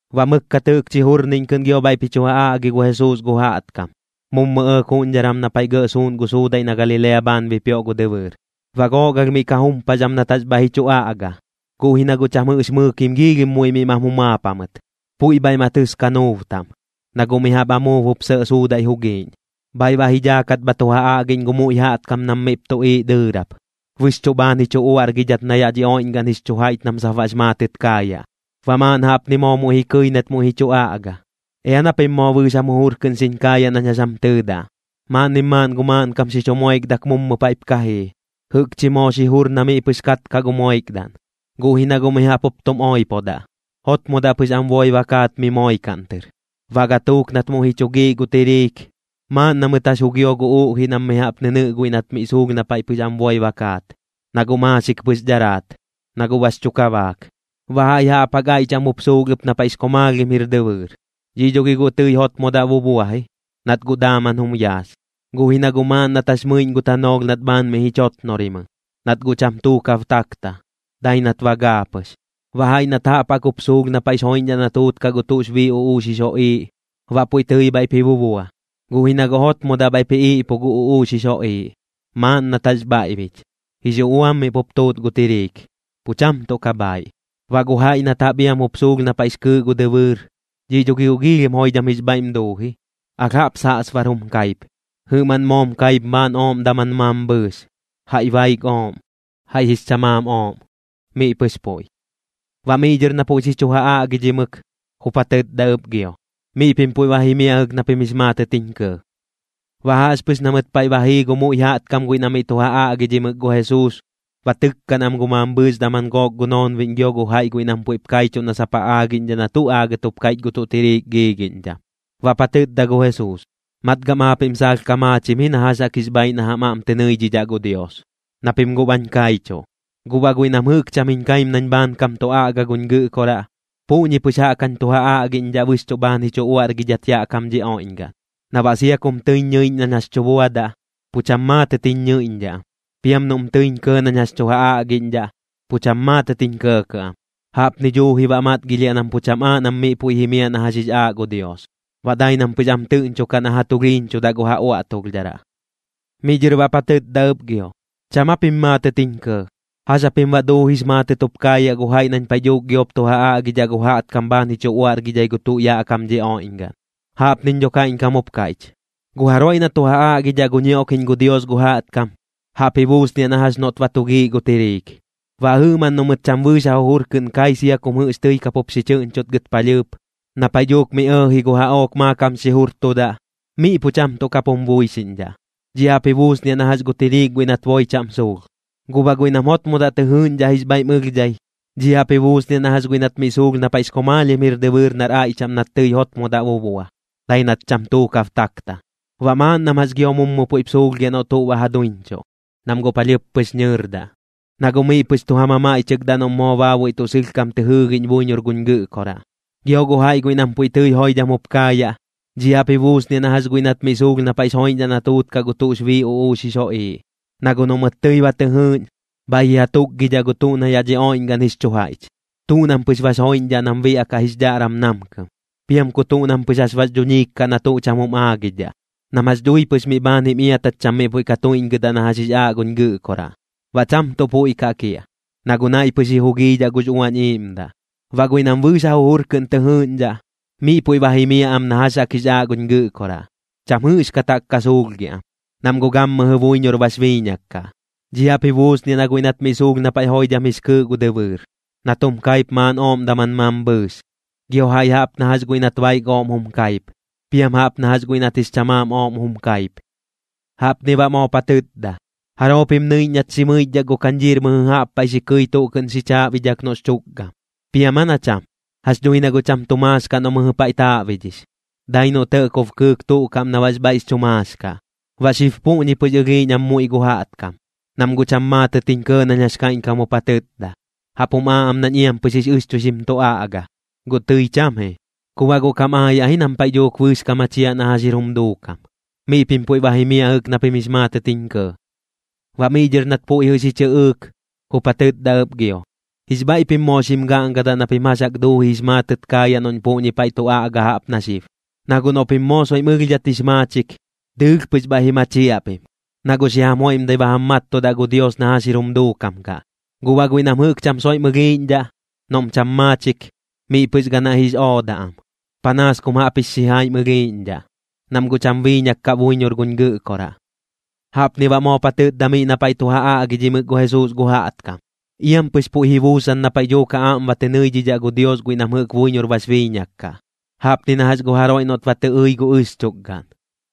Baꞌ mɨkkat jɨꞌkchi jurniꞌñ kɨꞌn gio bhaiꞌp ji chu ja aꞌgi gu Jesuus gu jaꞌtkam, mummu ɇɇk juꞌñdharan na paiꞌ gɇꞌ suuꞌn gu suudaiꞌ na Galilea bhaan bipioꞌ gu dɨbɨɨr. Baꞌ gook alh miꞌ ka jumpax am nat jax bhaiꞌ ji chu aꞌga, guꞌ ji na guꞌ cham jɨꞌx mɨɨkim giilhim muiꞌ miꞌ mam jumaap jamɨt. Puiꞌ bhaiꞌ ma tɨs kanuub taꞌm, na guꞌ mi jaꞌp amuub jup sɇꞌ suudaiꞌ jugiꞌñ. Bhaiꞌ baꞌ ji dhaakat bha tu ja aꞌgiꞌñ gu muiꞌ jaꞌtkam nam miꞌp tuꞌiiꞌ dɨɨrap. Bɨxchuꞌ bhaan ji chu uaꞌrgidhat na yaꞌ dhi oiꞌñgaꞌn jix chu jaiꞌch nam sap baꞌx maatɨt kaayaꞌ. Baꞌ maaꞌn jaꞌpni moo muiꞌ ji kɨi nat muiꞌ ji chu aꞌga: ―Ea na pim moo bɨɨx jam jujur kɨꞌn xiñ kaayaꞌ nañ jax jam tɨɨdaꞌ. Maaꞌnnim maaꞌn gu maaꞌnkam xi chu moikdak mummu paiꞌp ka jii, jɨꞌkchi moo xi jur na miꞌ pɨx katkaꞌ gu moikdaꞌn. Guꞌ ji na guꞌ mi jaꞌp tum oipodaꞌ, jotmodaꞌ pɨx am boi ba kaat mi moikaꞌn tɨr. Baꞌ gatuuk nat muiꞌ ji chu giiꞌ gu tiriik, maaꞌn na mɨt jax jugio gu uꞌjiꞌ nam mi jaꞌp nɨnɨꞌ guiꞌ nat miꞌ suulh na paiꞌ pɨx am boi ba kaat, na guꞌ maaxik pɨx dharaat, na guꞌ bax chu kabaak. Baꞌ jaiꞌ jaꞌp jaꞌk aiꞌ chaꞌm jup suulh ɨp na paiꞌx komaalhim jir dɨbɨɨr. Dhi dho gi guꞌ tɨi jotmodaꞌ bubua ji, nat guꞌ daaman jum yaas. Guꞌ ji na guꞌ maaꞌn nat jax mɨiꞌñ gu tanoolh nat bhaan miꞌ ji chotnorimɨ, nat guꞌ cham tuukab takta, dai nat ba gaa pɨx. Baꞌ jaiꞌ nat jaꞌp jaꞌk jup suulh na paiꞌx joiꞌñdhaꞌ na tuutkaꞌ gu tuꞌx bii uꞌuux jix joꞌiiꞌ, baꞌ puiꞌ tɨi bhaiꞌp ji bubua. Guꞌ ji na guꞌ jotmodaꞌ bhaiꞌp ji iꞌpu gu uꞌuux jix joꞌiiꞌ, maaꞌn nat jax bhaiꞌbich, jix uꞌuam miꞌ pup tuut gu tiriik, pu cham tuꞌ ka bhaaiꞌ. Baꞌ gu jaiꞌ nat jaꞌp iam jup suulh na paiꞌx kɨɨꞌ gu dɨbɨɨr, dhiꞌ dho gi guꞌ joidham jix bhaiꞌm duu ji, alh jaꞌp saꞌsbar jum kaip. Jɨꞌmaꞌn moom kaip maaꞌn ooꞌm daman mambhɨɨx, jaiꞌ baik ooꞌm, jaiꞌ jix chamaam ooꞌm, miꞌ pɨx puiꞌ. Baꞌ miꞌ dhɨr na puiꞌ jɨꞌ xi chu ja aꞌgidhimɨk, jup ja tɨtda ɨp gio: ―Miꞌ pim puiꞌ ba jimiaꞌ jɨꞌk na pim jix maatɨt jiñ kɇɇ. Baꞌ jaꞌxpɨx na mɨt paiꞌ ba jii gu muiꞌ jaꞌtkam guiꞌ na miꞌ tu ja aꞌgidhimɨk gu Jesuus, ba tɨkkaꞌn am gu mambhɨɨx daman gook gu noonbiꞌñ gio gu jaiꞌ guiꞌ nam puiꞌp kaichuꞌ na sap ja aagiꞌñdhaꞌ na tuꞌ aagɨt jup kaiꞌch gu tuꞌ tiriik giigiꞌñdham. Baꞌp ja tɨtda gu Jesuus: ―Matgam aapiꞌm saalh ka maachim ji na jax jaꞌk jix bhaaiꞌ na jam aꞌm tɨ nɨiꞌñdhaꞌ gu Dios, na pim guꞌ bañ kaichuꞌ. Guꞌ baꞌ guiꞌ nam jɨꞌk cham jiñ kaim nañ bhaankam tu aꞌga guñ Gɨꞌkoraꞌ, puꞌñi pɨx jaꞌk jañ tu ja aꞌgiꞌñdhaꞌ bɨxchuꞌ bhaan ji chu uaꞌrgidhat yaꞌ kam dhi oiꞌñgaꞌn. Na baꞌ sia kum tɨiñ ñɨiꞌñ nañ jax tu buadaꞌ, pu cham maatɨt ji ñɨiꞌñdhaꞌ am, piam noꞌm tɨiñ kɇɇ nañ jax tu ja aꞌgiꞌñdhaꞌ, pu cham maatɨt jiñ kɇɇkaꞌ am. Jaꞌpni dhuuji baꞌ matgilhiaꞌ nam pu cham aaꞌ nam miꞌ puiꞌ jimiaꞌ na jax jix aaꞌ gu Dios, baꞌ dai nam pɨx am tɨꞌñchukaꞌ na ja tulhiiñchudaꞌ gu ja uaꞌtulhdharaꞌ. Miꞌ dhɨr baꞌp ja tɨtda ɨp gio: ―¿Cham aa pim maatɨt jiñ kɇɇ? ¿Jax japim baꞌ duuji jix maatɨt jup kaayaꞌ gu jaiꞌ nañ paiꞌ dhuuk giop tu ja aꞌgidhaꞌ gu jaꞌtkam bhaan ji chu uaꞌrgidhai gu tuꞌ yaꞌ kam dhi oiꞌñgaꞌn? Jaꞌpniñ dho kaiꞌñkam jup kaiꞌch: Gu jaroiꞌ na tu ja aꞌgidhaꞌ gu ñioꞌkiꞌñ gu Dios gu jaꞌtkam, jaꞌp ji buusniaꞌ na jax noꞌt ba tu giiꞌ gu tiriik. Baꞌ jɨꞌmaꞌn noꞌ mɨt cham bɨɨx ja jujur kɨꞌn kai sia kum jɨꞌx tɨi kapup xi chɨꞌñchutgɨt palhɨɨp, na paiꞌ dhuuk miꞌ ɇɇji gu jaꞌook maakam xi jurtudaꞌ, miꞌ pu cham tuꞌ kap jum buixiꞌñdhaꞌ. Dhi jaꞌp ji buusniaꞌ na jax gu tiriik guiꞌ nat boi chaꞌm suulh. Guꞌ baꞌ guiꞌ nam jotmodaꞌ tɨ jɨɨꞌñdhaꞌ jix bhaiꞌm ɨlhdhai, dhiꞌ jaꞌp ji buusniaꞌ na jax guiꞌ nat miꞌ suulh na paiꞌx komaalhim jir dɨbɨɨr nar aiꞌ chaꞌm nat tɨi jotmodaꞌ bubua, dai nat cham tuukab takta. Baꞌ maaꞌn nam jax gio mummu puiꞌp suulhgiaꞌ noꞌ tuꞌ ba ja duiñchuꞌ, nam guꞌ palhɨɨp pɨx nɨɨrdaꞌ, na guꞌ miꞌ pɨx tu ja mamaiꞌchɨkdaꞌ noꞌm baabuiꞌ moo tuꞌ sɨlhkam tɨ jɨɨgiꞌñ buiñor guñ Gɨꞌkoraꞌ. Gio gu jaiꞌ guiꞌ nam puiꞌ tɨi joidham jup kaayaꞌ, dhiꞌ jaꞌp ji buusniaꞌ na jax guiꞌ nat miꞌ suulh na paiꞌx joiꞌñdhaꞌ na tuutkaꞌ gu tuꞌx bii uꞌux jix joꞌiiꞌ. Na guꞌ noꞌ mɨt tɨi ba tɨ jɨɨꞌñ, bhaiꞌ ji ja tukgidhaꞌ gu tuꞌ na yaꞌ dhi oiꞌñgaꞌn jix chu jaiꞌch. Tuꞌ nam pɨx bax joiꞌñdhaꞌ nam biaꞌkaꞌ jix dhaꞌram namkɨm, piam ku tuꞌ nam pɨx jax bax dhuñiik kaꞌ na tuꞌ cham jum aagidhaꞌ, nam jax dhui pɨx miꞌ bhaan jim iatat cham miꞌ puiꞌ ka tuiꞌñgɨdaꞌ na jax jix aaꞌ guñ Gɨꞌkoraꞌ. Baꞌ cham tuꞌ puiꞌ kaꞌ kiaꞌ, na guꞌ naiꞌ pɨx ji jugiidhaꞌ gux Uañ Iiꞌmdaꞌ. Baꞌ guiꞌ nam bɨɨx ja jujur kɨꞌn tɨ jɨɨꞌñdhaꞌ, miꞌ puiꞌ ba jimiaꞌ am na jax jaꞌk jix aaꞌ guñ Gɨꞌkoraꞌ, cham jɨꞌxkat jaꞌk ka suulhgiaꞌ am, nam guꞌ gammɨjɨ buiñor bax biiñak kaꞌ. Dhiꞌ jaꞌp ji buusniaꞌ na guiꞌ nat miꞌ suulh na paiꞌ joidham jix kɨɨꞌ gu dɨbɨɨr, nat jum kaip maaꞌn ooꞌm daman mambhɨɨx, gio jaiꞌ jaꞌp na jax guiꞌ nat baik ooꞌm jum kaip, piam jaꞌp na jax guiꞌ nat jix chamaam ooꞌm jum kaip. Jaꞌpni baꞌ moop ja tɨtda: ―¿Jaroo pim nɨiꞌñ nat xi mɨichdhak gu kañdhiir mɨjɨ jaꞌp paiꞌ xi kɨi tuꞌ kɨꞌn xi chaaꞌbidhak noꞌx chukgam? ¿Piam aa na cham? Jax dhui na guꞌ cham tu maax kaꞌ noꞌ mɨjɨ paiꞌ taaꞌbidhix, dai noꞌ tɇꞌkob kɨɨk tuꞌ kaꞌm na baꞌx bhaiꞌx chu maax kaꞌ. Baꞌ xib puꞌñi pɨx ɨlhiiꞌñ am gu muiꞌ jaꞌtkam, nam guꞌ cham maatɨt jiñ kɇɇ nañ jax kaiꞌñkam jup ja tɨtda. Jaꞌp jum aaꞌ am nañ iam pɨx jix ɨxchuixim tu aꞌga, guꞌ tɨi cham ji. Ku baꞌ guꞌ kam aayaꞌ ji nam paiꞌ dhuuk bɨɨx ka machiaꞌ na jax jir jum duukam. Miꞌ pim puiꞌ ba jimiaꞌ jɨꞌk na pim jix maatɨt jiñ kɇɇ. Baꞌ miꞌ dhɨr nat puiꞌ jɨꞌ xi chɨꞌɨɨk, jup ja tɨtda ɨp gio: ―Jix bhaiꞌ pim moo xim gaꞌngadaꞌ na pim jax jaꞌk duuji jix maatɨt kaayaꞌ noꞌñ puꞌñi paiꞌ tu aꞌga jaꞌp na xib. Na guꞌ noꞌ pim moo soiꞌm ɨlhdhat jix maachik, dɨɨlh pɨx bhaiꞌ ji machiaꞌ pim, na guꞌ xi jam joiꞌmdai ba jam mattudaꞌ gu Dios na jax jir jum duukam kaꞌ. Guꞌ baꞌ guiꞌ nam jɨꞌk cham soiꞌm ɨlhiiꞌñdhaꞌ, noꞌm cham maachik, miꞌ pɨx ganaiꞌ jix oodaꞌ am, panaas kum jaꞌp jix xijaim ɨlhiiꞌñdhaꞌ, nam guꞌ cham biiñak kaꞌ buiñor guñ Gɨꞌkoraꞌ. Jaꞌpni baꞌ moop ja tɨtda miꞌ na paiꞌ tu ja aꞌgidhimɨk gu Jesuus gu jaꞌtkam: ―Iam pɨx puiꞌ ji buusan na paiꞌ dhuuk ja aꞌm ba tɨ nɨiꞌñdhaꞌ gu Dios guiꞌ nam jɨꞌk buiñor bax biiñak kaꞌ, jaꞌpni na jax gu jaroiꞌ noꞌt ba tɨ ɨi gu ɨxchukgaꞌn,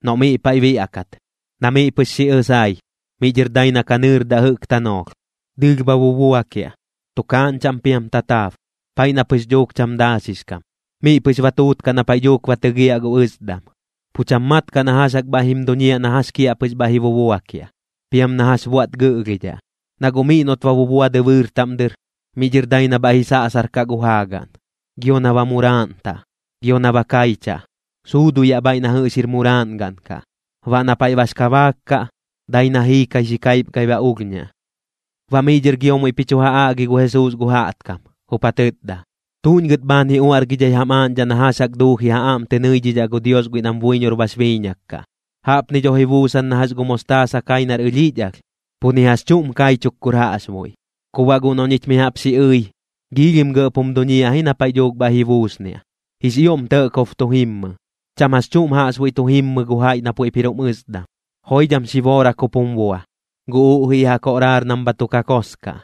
noꞌ miꞌ paiꞌ biaꞌkat. Na miꞌ pɨx xi ɨsai, miꞌ dhɨr dai na ka nɨɨrdaꞌ jɨꞌk tanoolh, dɨɨlh bha bubuakiaꞌ, tukaaꞌñ chaꞌm piam tataab, paiꞌ na pɨx dhuuk cham daaxix kam. Miꞌ pɨx ba tuutkaꞌ na paiꞌ dhuuk ba tɨgiaꞌ gu ɨsdam, pu cham mat kaꞌ na jax jaꞌk bhaiꞌ jim duñiaꞌ na jax kiaꞌpɨx bhaiꞌ ji bubuakiaꞌ, piam na jax buaꞌt gɨꞌlhidhaꞌ. Na guꞌ miꞌ noꞌt ba bubua dɨbɨɨr taꞌm dɨr, miꞌ dhɨr dai na bhaiꞌ ji saꞌsarkaꞌ gu jaagaꞌn, gio na ba muraaꞌntaꞌ, gio na ba kaichaꞌ, suuduyaꞌ bhaiꞌ na jɨꞌx jir muraaꞌngaꞌn kaꞌ. Baꞌ na paiꞌ bax kabaak kaꞌ, dai na jiikai xi kaipgai baꞌ ulhñaꞌ. Baꞌ miꞌ dhɨr gio muiꞌp ji chu ja aꞌgi gu Jesuus gu jaꞌtkam, jup ja tɨtda: ―¿Tuꞌñ gɨt bhaan ji uaꞌrgidhai jam aaꞌñdhaꞌ na jax jaꞌk duuji ja aꞌm tɨ nɨiꞌñdhaꞌ gu Dios guiꞌ nam buiñor bax biiñak kaꞌ? Jaꞌpni dho ji buusan na jax gu mostaasa kai nar ɨlhiꞌch alh, pu ni jax chuꞌm kaichuk kur jaꞌxbuiꞌ. Ku baꞌ guꞌ noꞌ ñich mi jaꞌp xi ɨi, giilhim gɇꞌp jum duñiaꞌ ji na paiꞌ dhuuk bhaiꞌ ji buusniaꞌ, jix ioꞌm tɇꞌkob tu jimmɨ, cham jax chuꞌm jaꞌxbuiꞌ tu jimmɨ gu jaiꞌ na puiꞌp jir jum ɨsdam. Joidham xi boorak jup jum bua, gu uꞌjiꞌ ja koꞌraar nam bha tu kakos kaꞌ.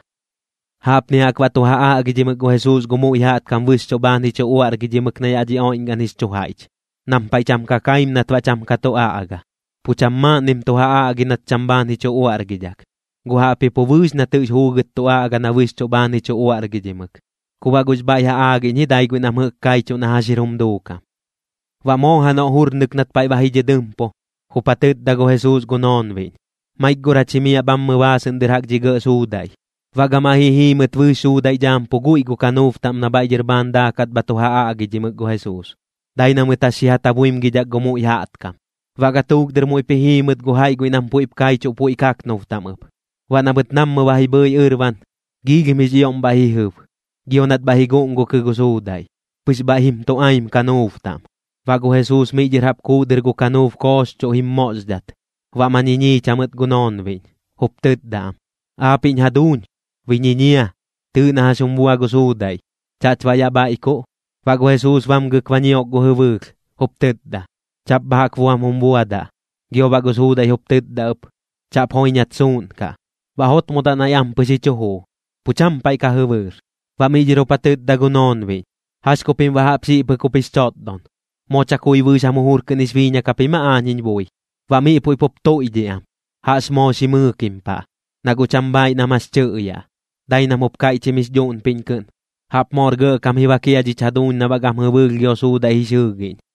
Jaꞌpni jaꞌk baꞌ tu ja aꞌgidhimɨk gu Jesuus gu muiꞌ jaꞌtkam bɨxchuꞌ bhaan ji chu uaꞌrgidhimɨk na yaꞌ dhi oiꞌñgaꞌn jix chu jaiꞌch. Nam paiꞌ cham ka kaim nat baꞌ cham ka tu aꞌga. Pu cham maaꞌnnim tu ja aꞌgi nat cham tuꞌ bhaan ji chu uaꞌrgidhak, guꞌ jaꞌpji pu bɨɨx nat jɨꞌx juugɨt tu aꞌga na bɨxchuꞌ bhaan ji chu uaꞌrgidhimɨk. Ku baꞌ guꞌx bhaiꞌ ja aagiꞌñ ji dai guiꞌ nam jɨꞌk kaichuꞌ na jax jir jum duukam. Baꞌ moo janoꞌ jurnɨk nat paiꞌ ba ji dhɨdɨmpu, jup ja tɨtda gu Jesuus gu noonbiꞌñ: ―Maik gor jach jimiaꞌ bhammɨ baasɨꞌn dɨr jaꞌk dhi gɇꞌ suudaiꞌ. Baꞌ gamaiꞌ ji jii mɨt bɨɨx suudaiꞌ dhaam pu guiꞌ gu kanuub taꞌm na bhaiꞌ dhɨr bhaan daakat bha tu ja aꞌgidhimɨk gu Jesuus, dai na mɨt jax xi ja tabuimgidhak gu muiꞌ jaꞌtkam. Baꞌ gatuuk dɨr muiꞌp ji jii mɨt gu jaiꞌ guiꞌ nam puiꞌp kaichuꞌ puiꞌ kaknub taꞌm ɨp. Baꞌ na mɨt nammɨ ba ji bhɨi ɨrban, giilhim jix ioꞌm bhaiꞌ ji jɨb, gio nat bhaiꞌ ji guꞌngukɨ gu suudaiꞌ, pɨx bhaiꞌ jim tuꞌaim kanuub taꞌm. Baꞌ gu Jesuus miꞌ dhɨr jaꞌp kuuꞌ dɨr gu kanuub kooxchuꞌ jim moꞌxdhat. Baꞌ ma ñiñiich jamɨt gu noonbiꞌñ, jup tɨtda am: ―Aapiꞌñ jaduuñ, ¡bi ñiñia! ¡Tɨɨꞌ na jax jum bua gu suudaiꞌ! ¿Chaꞌch baꞌ yaꞌ bhaiꞌkuꞌ? Baꞌ gu Jesuus bamgɨk ba ñiok gu jɨbɨɨlh, jup tɨtda: ―¡Chaꞌp bha jaꞌk buam jum buadaꞌ! Gio baꞌ gu suudaiꞌ jup tɨtda ɨp: ―¡Chaꞌp joiñat suuꞌnkaꞌ! Baꞌ jotmodaꞌ naiꞌ ampɨx ji chu juu, pu cham paiꞌ ka jɨbɨɨr. Baꞌ miꞌ dhɨr jup ja tɨtda gu noonbiꞌñ: ―¿Jax ku pim baꞌ jaꞌp xiꞌ pɨk jup jix chotdon? ¿Moo chakui bɨɨx jam jujur kɨꞌn jix biiñak japim aa aañ jiñ bui? Baꞌ miꞌ puiꞌ pup tuiꞌdhiꞌ am, jaꞌx moo xi mɨɨkim paꞌ, na guꞌ cham bhaiꞌ nam jax tɨꞌyaꞌ. Dai nam jup kaiꞌchim jix dhuꞌnpiꞌñ kɨꞌn: ―¡Jaꞌp moor gɇꞌkam ji bak jia dhich jaduuñ na baꞌ gam jɨbɨɨlh gio suudaiꞌ jix jɨɨgiꞌñ!